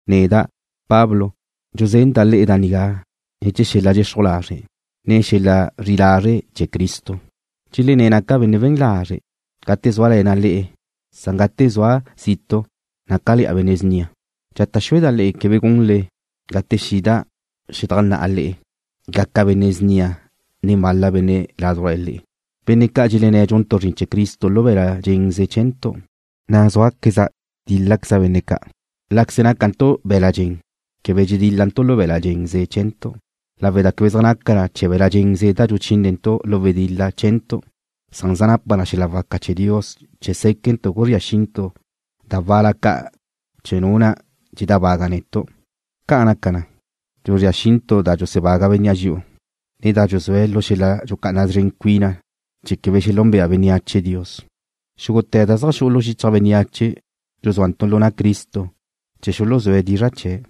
Neda', Pablo, dxuzenda' le'e da nigá ne̱ chee̱ xel-la dxexruj lazre', ne xel-la zri'i lazre' chee̱ Cristo. Dxelenné̱' naca' benne' zren lazre' gate zúale̱na' le'e, na' gate zua' zitu' nácale̱'a benne' snia. Dxata' xueda' le'e quebe gunle, gate xida' xedajnná'a le'e, gaca' benne' snia nen bal-la benne' ládujla le'e, benne' ca' dxelenné̱' dxuntu' zrin chee̱ Cristo lu be̱la' dxenze chee̱ntu', na' zúaqueza' tíl-laqueza' benne' ca'. Láqueze nácantu' be̱la' dxen quebe dxedíl-lantu' lu be̱la' dxenze chee̱ntu', lawe' da quebe zaj naca chee̱ be̱la' dxenze da dxuchínentu' lu wedil-la chee̱ntu', san zaj napa na xel-la waca chee̱ Dios chee̱ séquentu' guzría xintu' da wal-la ca' chee̱ nu na' dxedábaga' netu'. Ca'an naca, dxuzría xintu' da dxusebaga bénnea' dxi'u, ne da dxuzúe̱' lu xel-la dxucá'ana szren cuina chee̱ quebe xelúnbea bénneache Dios. Xúgute̱ da zaj xu'u lu xichaj bénneache dxuzúantu' lu na' Cristo chee̱ xuluzúe̱' dizra' chee̱'.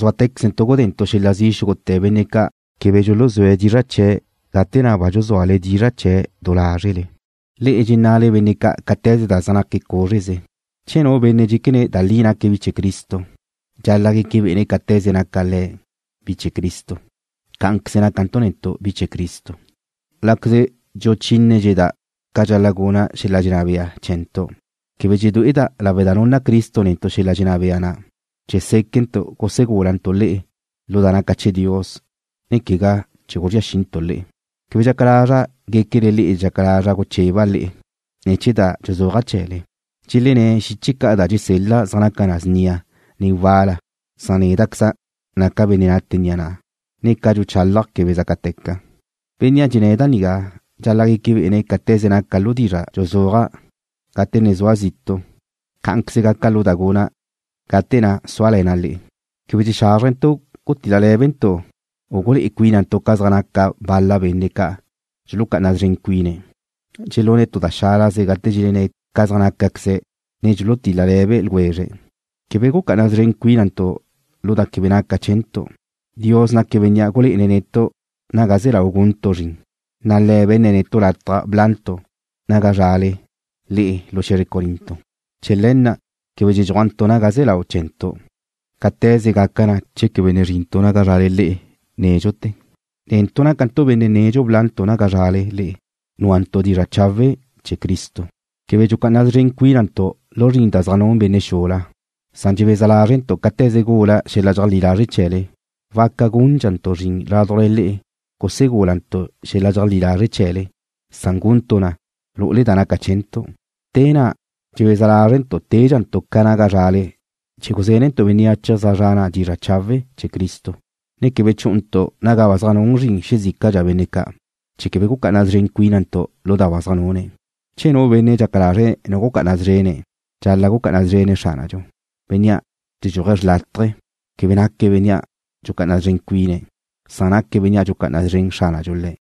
Zuáte̱quezentu' gudentu' xel-la zi' xúgute̱ benne' ca' quebe dxuluzúe̱' dizra' chee̱' gate na' ba dxuzúale dizra' chee̱' du lázrele. Le'e dxenna'le benne' ca' cáte̱ze da zaj naque̱' cúzreze. Che nu benne' dxéquene̱' da li naque̱' bi chee̱ Cristo, dxal-la' gueque bé'ene̱' cáte̱ze na' naca le̱' bi chee̱ Cristo, cá'anqueze nácantu' netu' bi chee̱ Cristo. Láqueze dxuchínedxeda' ca dxal-la' guna' xel-la dxenná bea chee̱ntu', quebe dxedué'eda' lawe' da nunna Cristo netu' xel-la dxenná bea na' chee̱ séquentu' gusegúlantu' le'e lu da naca chee̱ Dios, ne quegá chee̱ guzría xintu' le'e. Quebe dxaca lazra' guéquele le'e dxaca lazra' gucheba' le'e ne̱ chee̱ da dxuzúaja' chee̱le. Dxelenné̱' xiche ca' da dxusél-la' zaj naca na snia, ne wal-la, san néda'queza' naca' benne' nate ni'a na', ne ca dxuchálaja' quebe zácateca. Bénnea' dxenné̱' da nigá dxal-la' gueque bé'ene̱' cáte̱ze naca' lu dizra' dxuzúaja' gate ne zua' zitu', cá'anqueze gaca' lu da guna' gate na' súale̱na' le'e. Quebe dxexázrentu' gutil-le lé̱bentu', u gulé'e cuínantu' ca zaj naca bal-la benne' ca' dxulucá'ana szren cuine̱'. Dxelune̱' tu da xálaze gate dxelenné̱'e̱ ca da zaj nácaqueze̱', ne dxulutil-le le̱be ljwezre̱'. Quebe gucá'ana szren cuínantu' lu da quebe naca chee̱ntu'. Dios naque̱' Bénnea' gulé'ene̱' netu' naga ze lau guntu' zrin, na' Le̱' be̱nne̱' netu' lataj blantu' naga zrale le'e lu xe̱zre Corinto. Chee̱ le̱ na' quebe dxedxúajntu' naga ze lau chee̱ntu', cáte̱ze gaca na che quebe ne zrintu' naga zrale le'e nédxute̱. Netu' nácantu' benne' nedxu blantu' naga zrale le'e núantu' dizra' chawe' chee̱ Cristo. Quebe dxucá'ana szren cuínantu' lu zrin da zaj nun benne' xula, san dxebeza lázrentu' cáte̱ze gula xel-la dxeajlí lazre' chee̱le, waca gúndxantu' zrin ládujla le'e gusegúlantu' xel-la dxeajlí lazre' chee̱le, san guntu' na lu'ule da naca chee̱ntu'. Te na' dxebeza lázrentu' tédxantu' ca naga zrale chee̱ guzénentu' bénneache zaj zre̱'e̱ ga na' dizra' chawe' chee̱ Cristo, ne quebe chú'untu' naga ba zaj nun zrin xezícadxa benne' ca', chee̱ quebe gucá'ana szren cuínantu' lu da ba zaj nune̱'. Che nu benne' dxaca lazre̱' nu gucá'ana szrene̱', dxal-la' gucá'ana szrene̱' Xránadxu. Bénnea' dxexedxúaj xrlátaje, quebe naque̱' benne' dxucá'ana szren cuine̱', san naque̱' bénnea' dxucá'ana szren Xránadxu le̱'.